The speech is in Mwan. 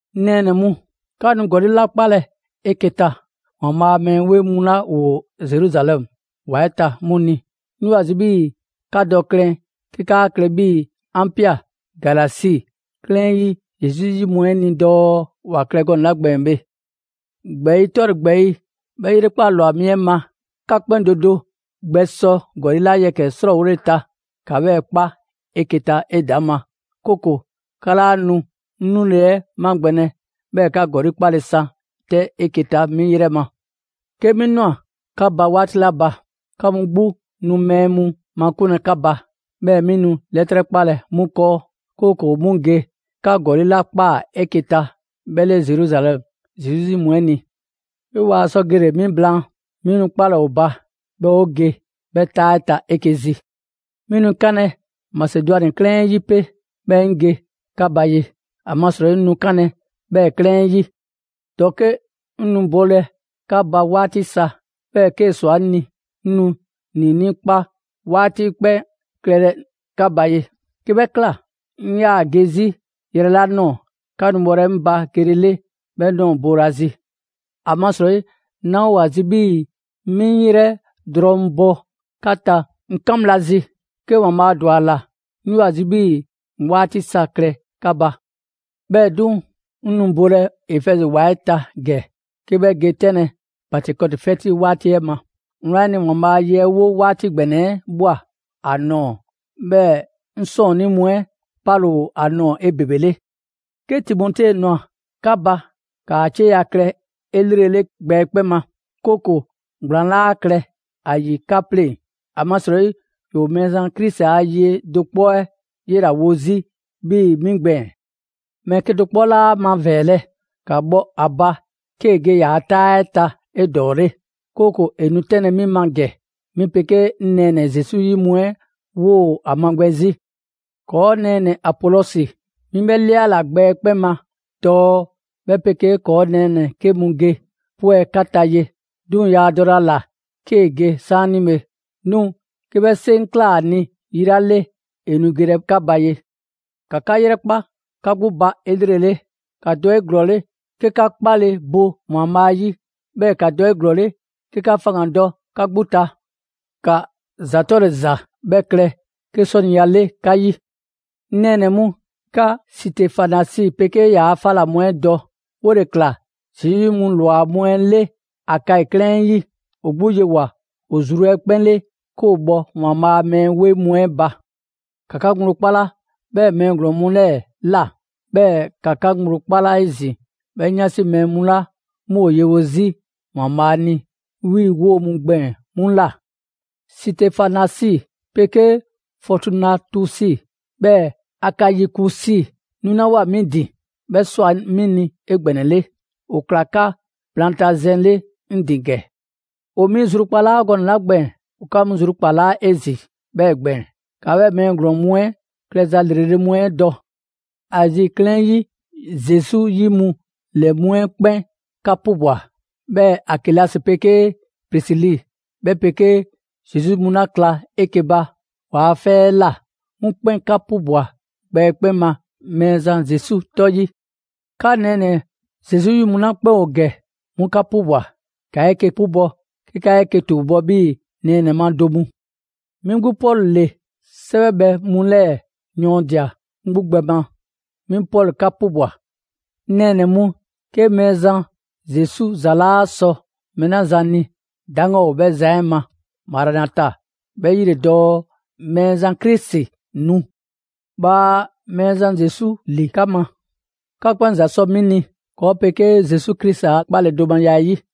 'Ŋ nɛɛnɛ‑ mu, 'ka nu ‑gɔli' 'la 'kpalɛ‑ 'eke‑ ta ‑Waanbhaa' a mɛɛ 'weŋ mu 'la ‑woo Zeruzalɛmu ‑wa 'ɛ ta 'mu ni, 'ŋ 'yoo‑ ‑a zi' 'bhii‑ 'ka dɔ klɛn 'ke 'ka 'a klɛ 'bhii‑ 'an ꞊pia Galasi 'klɛɛn 'yi Zesu 'yi mu 'ɛ ni dɔɔ ‑wa klɛ gɔnɛ‑ 'la gbɛɛn‑ bhe. ‑Gbɛɛyi' 'tɔle‑ ‑gbɛɛyi' 'bhɛ 'yrekpaa‑ ‑lwa mi 'ɛ ma, 'ka 'kpɛn do do gbɛ sɔ ‑gɔli' yɛkɛ‑ 'la 'srɔɔwole ta, ‑ka 'bhɛɛ‑ 'kpa 'eke‑ ta 'edaŋma; 'kooko‑ 'ka 'laa nu 'ŋ 'nule‑ 'ɛ magbɛnlɛ, 'bhɛɛ‑ 'ka ‑gɔli' 'kpale‑ san 'tɛ 'eke‑ ta 'mi 'yrɛ ma. 'Ke 'mi ꞊nwa 'ka ba 'waati 'la ba, 'ka mu 'gbu nu mɛɛ mu makunlɛ 'ka ba, 'bhɛɛ‑ 'mi nu 'lɛtrɛ 'kpalɛ‑ 'mu 'kɔɔ; 'kooko‑ 'mu ge 'ka ‑gɔli' 'la ꞊kpaa 'eke‑ ta 'bhɛ 'le Zeruzalɛmu Zesu 'yi mu 'ɛ ni. 'Ke waa sɔ gele‑ 'mi blaan, 'mi nu 'kpalɛ‑ ‑o ba, 'bhɛɛ‑ 'o ge 'bhɛ 'taa 'ɛ ta 'eke‑ zi. 'Mi nu 'kanlɛ‑ Masedwani 'klɛɛn 'ɛ 'yi 'pe, 'bhɛɛ‑ 'ŋ ge 'ka ba ye, ‑amasrɔyi 'ŋ nu 'kanlɛ‑ 'bhɛ 'klɛɛn 'ɛ 'yi. ‑Dɔke' 'ŋ nu bolɛ 'ka ba 'waati sa, 'bhɛɛ‑ 'kee‑ ‑swa 'ŋ ni, 'ŋ nu ‑niinii' 'kpa 'waati 'ɛ 'kpɛn klɛlɛ 'ka ba ye. 'Ke 'bhɛ ꞊kla, 'ŋ 'yaa‑ ge 'zi yrɛ 'la ꞊nɔɔ, 'ka nu bhɔlɛ 'ŋ ba gelele 'bhɛ ꞊nɔɔ boolazi. ‑Amasrɔyi 'naa‑ ‑o ‑a zi 'bhii‑ 'mi 'ŋ 'yrɛ drɔŋ bɔ 'ka ta 'ŋ 'kan bhla zi. 'Ke ‑Waanbhaa' ‑dwa ‑a ‑la, 'ŋ 'yoo‑ ‑a zi 'bhii‑ 'ŋ 'waati sa klɛ 'ka ba. 'Bhɛɛ‑ 'duŋ‑, 'ŋ nu bolɛ Efɛzi ‑wa 'ɛ ta ‑gɛ 'ke 'bhɛ ge 'tɛnlɛ‑ Pantekɔti 'fɛti 'waati 'ɛ ma. Wlan 'ɛ ni, ‑Waanbhaa' a ye 'ɛ 'wo 'waati ‑gbɛnɛ 'ɛ ꞊bhwa ‑a ꞊nɔɔ; 'bhɛɛ‑ 'ŋ 'sɔɔnnii mu 'ɛ 'pale‑ ‑o ‑a nɔɔ‑ 'ebebele. 'Ke Timote ꞊nwa 'ka ba, ‑kaa 'cieya‑ klɛ 'elrele gbɛ 'ɛ 'kpɛn ma, 'kooko‑ ‑gblaan 'laa klɛ ‑a ‑yi 'ka 'pleŋ‑; ‑amasrɔyi ‑yoo Mɛɛzan Krisi a ye do 'kpɔ 'ɛ 'yela‑ wo 'zi 'bhii‑ 'mi gbɛɛn‑. Mɛɛ 'kedo‑ 'kpɔ 'laa ‑a mavɛɛlɛ! ‑Ka bhɔ ‑a ba 'kee‑ ge ‑yaa' 'taa 'ɛ ta 'edɔɔle; 'kooko‑ ‑e nu 'tɛnlɛ‑ 'mi ma ‑gɛ, 'mi 'pegee 'ŋ nɛɛnɛ‑ Zesu 'yi mu 'ɛ 'woo‑ ‑a magbɛn 'zi. ‑Kɔɔ' nɛɛnɛ‑ Apolɔsi, 'mi 'bhɛ 'liala‑ gbɛ 'ɛ 'kpɛn ma dɔɔ 'bhɛ 'pegee ‑kɔɔ' nɛɛnɛ‑ 'ke mu ge 'pwɛ 'ka ta ye; 'duŋ‑ yaa dɔlɛ ‑a ‑la 'kee‑ ge 'saanibhe. 'Duŋ‑ 'ke 'bhɛ 'seŋ ꞊kla ‑a ni yi 'la 'le, ‑e nu gelɛ 'ka ba ye. ‑Ka 'ka 'yrɛkpa 'ka 'gbu ba 'elrele, ‑ka dɔ 'eglɔɔle 'ke 'ka 'kpale‑ bo ‑Waanbhaa' 'yi. 'Bhɛɛ‑ ‑ka dɔ 'eglɔɔle 'ke 'ka faŋgandɔ 'ka 'gbu ta. ‑Ka ‑za 'tɔle‑ ‑za 'bhɛ klɛ 'ke 'sɔniya 'le 'ka 'yi. 'Ŋ nɛɛnɛ‑ mu, 'ka Sitefanasi 'pegee ‑yaa' 'fa ‑la mu 'ɛ dɔ: 'wole‑ ꞊kla Zesu 'yi mu ‑lwa mu 'le Akayi 'klɛɛn 'ɛ 'yi. ‑O 'gbu yewoa‑ ‑o zru 'ɛ 'kpɛn 'le 'ke ‑o bhɔ ‑Waanbhaa' a mɛɛ 'weŋ mu 'ɛ ba. ‑Ka 'ka ŋgblo 'kpala 'bhɛɛ‑ mɛɛ ‑glɔɔn mu ‑lɛɛ ꞊la, 'bhɛɛ‑ ‑ka 'ka ŋgblo 'kpala 'ezin‑ 'bhɛ 'yansi mɛɛ mu 'la 'mu ‑o yewo 'zi ‑Waanbhaa' ni 'bhii‑ 'woo‑ gbɛɛn‑ 'mu ꞊la. Sitefanasi 'pegee Fɔɔtunatusi, 'bhɛɛ‑ Akayikusi 'nulawoa 'mi ‑din, 'bhɛ ꞊swa 'mi ni 'egbɛnɛle. ‑O ꞊kla 'ka blaantazɛn 'le 'ŋ ‑din ‑gɛ. ‑O 'mi zrukpalaa gɔnɛ‑ 'la gbɛɛn‑, ‑o 'ka mu zrukpalaa 'ezin‑ 'bhɛɛ‑ gbɛɛn‑. ‑Ka 'bhɛɛ‑ mɛɛ ‑glɔɔn mu 'ɛ klɛza ‑lrele' mu 'ɛ dɔ. Azi 'klɛɛn 'yi Zesu 'yi mu ‑lɛ mu 'ɛ 'kpɛn 'ka 'pubwa‑. 'Bhɛɛ‑ Akilasi 'pegee Prisili, 'bhɛ 'pegee Zesu 'yi mu 'la kla 'eke‑ ba ‑waa' 'fɛ 'ɛ ꞊la, 'mu 'kpɛn 'ka 'pubwa‑ gbɛ 'ɛ 'kpɛn ma Mɛɛzan Zesu 'tɔ 'yi. 'Ka nɛɛnɛ‑ Zesu 'yi mu 'la 'kpɛn ‑o ‑gɛ, 'mu 'ka 'pubwa‑. ‑Ka 'eke‑ 'pubɔ‑ 'ke 'ka 'eke‑ ‑tuubɔ' 'bhii‑ nɛɛnɛ‑ ma do mu. 'Mi 'gbu Pɔlu ‑le 'sɛwɛbhɛ mu 'lɛɛ‑ yɔɔndia‑ 'ŋ 'gbu gbɛ ma: «'Mi Pɔlu 'ka 'pubwa‑.» 'Ŋ nɛɛnɛ‑ mu, 'ke Mɛɛzan Zesu ‑za 'laa sɔ mɛɛ 'la zan ni, 'daŋgan ‑o 'bhɛ zan 'ɛ ma! «Maranata». 'Bhɛ 'yi ‑le dɔɔ: Mɛɛzan Krisi, nu! Bhaa Mɛɛzan Zesu ‑li 'ka ma! 'Ka 'kpɛn ‑za sɔ 'mi ni ‑kɔɔ' 'pegee Zesu Krisi a 'kpaledomaya 'ɛ 'yi.